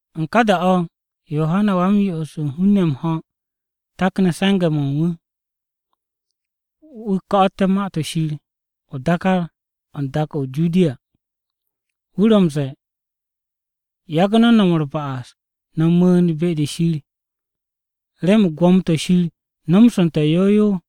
U̱n ká da-o̱ o̱, Yohana Wa-m-Yo'os u̱n hun-ne̱ m-ho̱, takne̱ se̱nge̱-mo̱ u̱n wu̱. Wu̱ ko̱'o̱te̱ Ma-to̱ Shir o-dákár o̱ u̱n dak-o̱ o-Judiya. Wu̱ ro̱ m-ze̱e̱, “Yagu̱ no̱ no̱m u̱r-ba'as, no̱ mu̱u̱n be-de Shir, remen Gwo̱mo-to̱ Shir nomsu̱nte̱ yow yow.”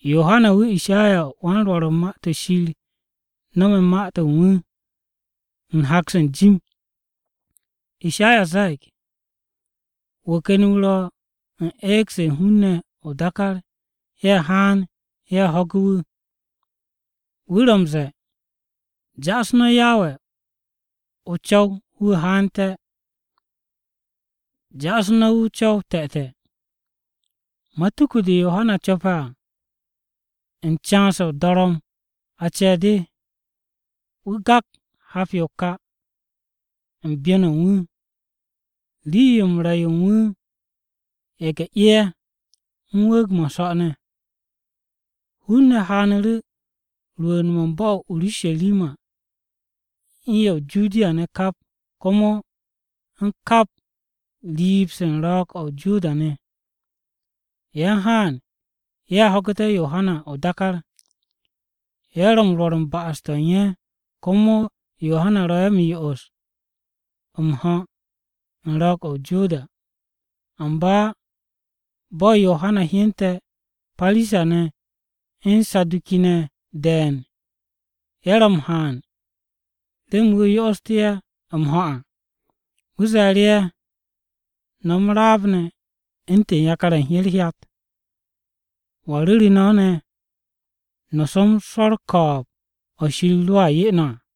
Yohana wu̱ Ishayawan-Rwo̱r u̱n Ma-to̱ Shir no̱me̱ ma-to̱ u̱n wu̱, u̱n hak-se n-jim. Ishaya ze̱e̱g, “Wu̱ ken wu̱ ro̱ u̱n eeg-se u̱n hun-ne̱ o-dákár ye̱ haan ye̱ ho̱ge̱ wu̱. Wu̱ ro̱ m-ze̱e̱, ‘Ja'asu̱ no̱ Yawe o-co̱w wu̱ haante̱. Ja'asu̱ no̱ wu̱ o-co̱w te̱te̱.’” Matuku-de Yohana co̱pe̱ à, u̱n can-se o-dorom a ce̱e̱ o̱. Wu̱ gak hap-yo o-ka u̱n byon-o u̱n wu̱. Rii-yo m-re̱ yo u̱n wu̱ ye̱ge̱-'e ye̱ u̱n wu̱u̱g-mo̱ u̱n so̱ ne̱. Hun-ne̱ haanu̱ru̱ rwu̱u̱n-mo̱ u̱n bo̱-o̱ o-Urusharima u̱n ye̱ o-Judiya ne̱ kap, komo u̱n kap riib-se u̱n Ro̱o̱g-o̱ o-Joda ne̱. Ye̱ u̱n haan ye̱ ho̱gu̱té̱ Yohana o-dákár. Ye̱ ro̱ m-rwo̱r u̱n ba'as-to̱ u̱n ye̱, komo Yohana ro̱ ye̱ m-yo'os m-ho̱ u̱n Ro̱o̱g-o̱ o-Joda. Amba bo̱ Yohana hyente̱ Parisa-ne̱ u̱n Saduki-ne̱ de̱e̱n ye̱ ro̱ m-haan remen wu̱ yo'ostú̱ ye̱ m-ho̱ à, wu̱ ze̱e̱ru̱ ye̱, “No̱ m-raab ne̱ u̱ntu̱n yakar-ye̱ u̱n herhyat! ¿Wa ru̱re̱ no̱ ne̱ no̱ som swo̱ u̱r-ko̱o̱b o̱ Shir ro̱a 'ye no̱ à?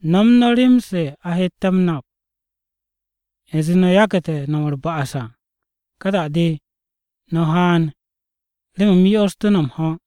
No̱m no̱ rem-se a hette̱ m-nap u̱nze no̱ yagu̱te̱ no̱m u̱r-ba'as à. Ka da-de, no̱ haan remen u̱m yo'ostú̱ no̱ m-ho̱.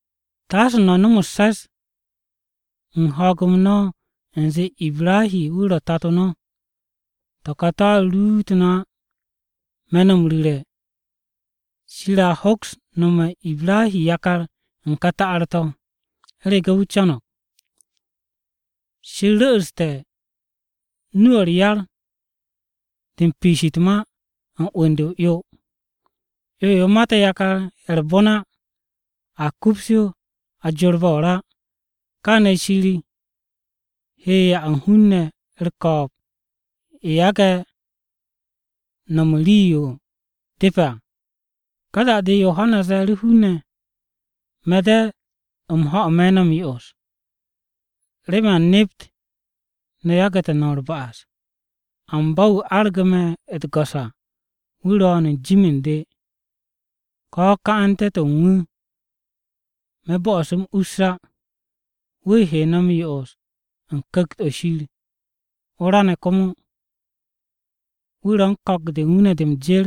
Taase no̱ nom u̱s-se̱s u̱n ho̱o̱g-m no̱ u̱nze Ibrahi wu̱ ro̱ Tato no̱. To̱ka to̱a ruut no̱ á. Me̱ no̱ m-ru̱re̱, Shir a hoks nome̱ u̱n Ibrahi yakar u̱n ka ta'ar-to̱. (U̱rege̱ wu̱ co̱no̱g). Shir ru̱'u̱ste̱ nu-o̱ u̱r-yar o̱ u̱n piish u̱t-ma u̱n 'wu̱n-de o-'yo. 'Yo-yo mate̱ yakar-ye̱ u̱r-bon á, a kups yo a jorbe̱ o-ra. Kaane̱ Shir he 'ya u̱n hun-ne̱ u̱r-ko̱o̱b ye̱ yage̱ no̱m u̱n rii-yo depe̱ à.” Ka da-de Yohana ze̱e̱ru̱ hun-ne̱, “Me̱ de̱ m-ho̱ me̱ no̱ m-yo'os, remen a nept no̱ yagu̱te̱ no̱m u̱r-ba'as. Amba wu̱ argu̱ me̱ u̱t-go̱s à wu̱ ro̱o̱n u̱n jim u̱n de, ko̱ ka'ante̱-to̱ u̱n wu̱ me̱ bo'os u̱m us to̱ á. Wu̱ he no̱ m-yo'os u̱n Ku̱kt-o̱ Shir, o-ra ne̱ komo. Wu̱ ro̱ u̱n ko̱k-de u̱n wu̱ ne̱ de m-jer,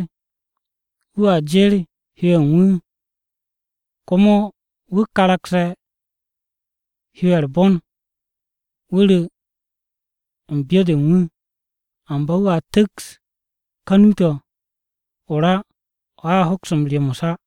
wu̱a jer hyo-ye̱ u̱n wu̱. Komo wu̱ karakse̱ hyo-ye̱ u̱r-bon, wu̱ ru̱ n-me̱ u̱n byo-de u̱n wu̱, amba wu̱a tu̱ks ka nu-to̱ o-ra o̱ a hoks m-ryomos á.”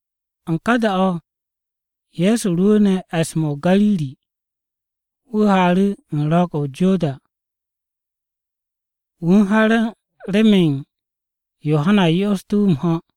U̱n ka da-o̱ Ye̱so rwu̱u̱ne̱ e̱s-mo̱ o-Gariri, wu̱ haaru̱ u̱n Ro̱o̱g-o̱ o-Joda. Wu̱ u̱n ha remen Yohana yo'ostú̱ wu̱ m-ho̱.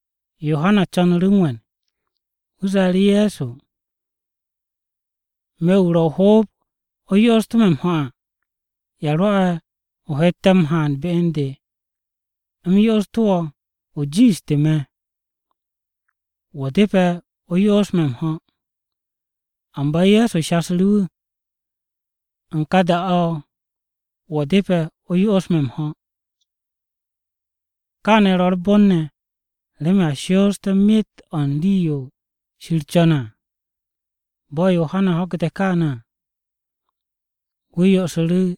Yohana co̱nu̱ru̱ wu̱ m-we̱n. Wu̱ ze̱e̱ru̱ Ye̱so, “Me̱, wu̱ ro̱ o-hoob o yo'ostú̱ me̱ m-ho̱ à, ¿ya rwo̱'e̱ o hette̱ m-haan be u̱n de u̱m yo'ostu̱ wo̱? O jiishtu̱ me̱. Wo̱ depe̱ o yo'os me̱ m-ho̱.” Amba Ye̱so shasu̱ru̱ wu̱, “U̱n ka da-o̱ wo̱ depe̱ o yo'os me̱ m-ho̱. Kaane̱ ro̱ u̱r-bon ne̱ remen a shooste̱ myet o̱ u̱n rii-yo Shir co̱ne̱ à.” Bo̱ Yohana ho̱gu̱te̱ kaane̱ à wu̱ yo'osu̱ru̱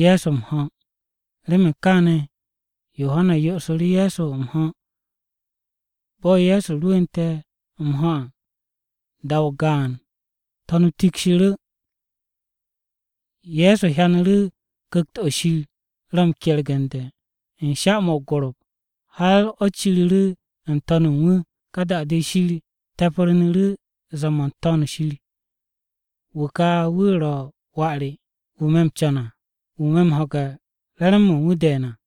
Ye̱so m-ho̱. Remen kaane̱ Yohana yo'osu̱ru̱ Ye̱so m-ho̱. Bo̱ Ye̱so rwu̱nte̱ m-ho̱ à, da-o gaan, To̱n-o tikshiru̱. Ye̱so hyanu̱ru̱ Ku̱kt-o̱ Shir ro̱ m-kergu̱ne̱ u̱n sha-mo̱ o-gorop, har o̱ ciru̱ru̱ n-to̱n u̱n wu̱. Ka da-de Shir te̱pru̱nu̱ru̱ zee-mo̱ n-To̱n o-shir, “Wu̱ ka wu̱ ro̱ Wà re, wu̱ me̱ m-co̱n à. Wu̱ me̱ m-ho̱ge̱ re̱re̱m-mo̱ u̱n wu̱ de̱e̱n à.”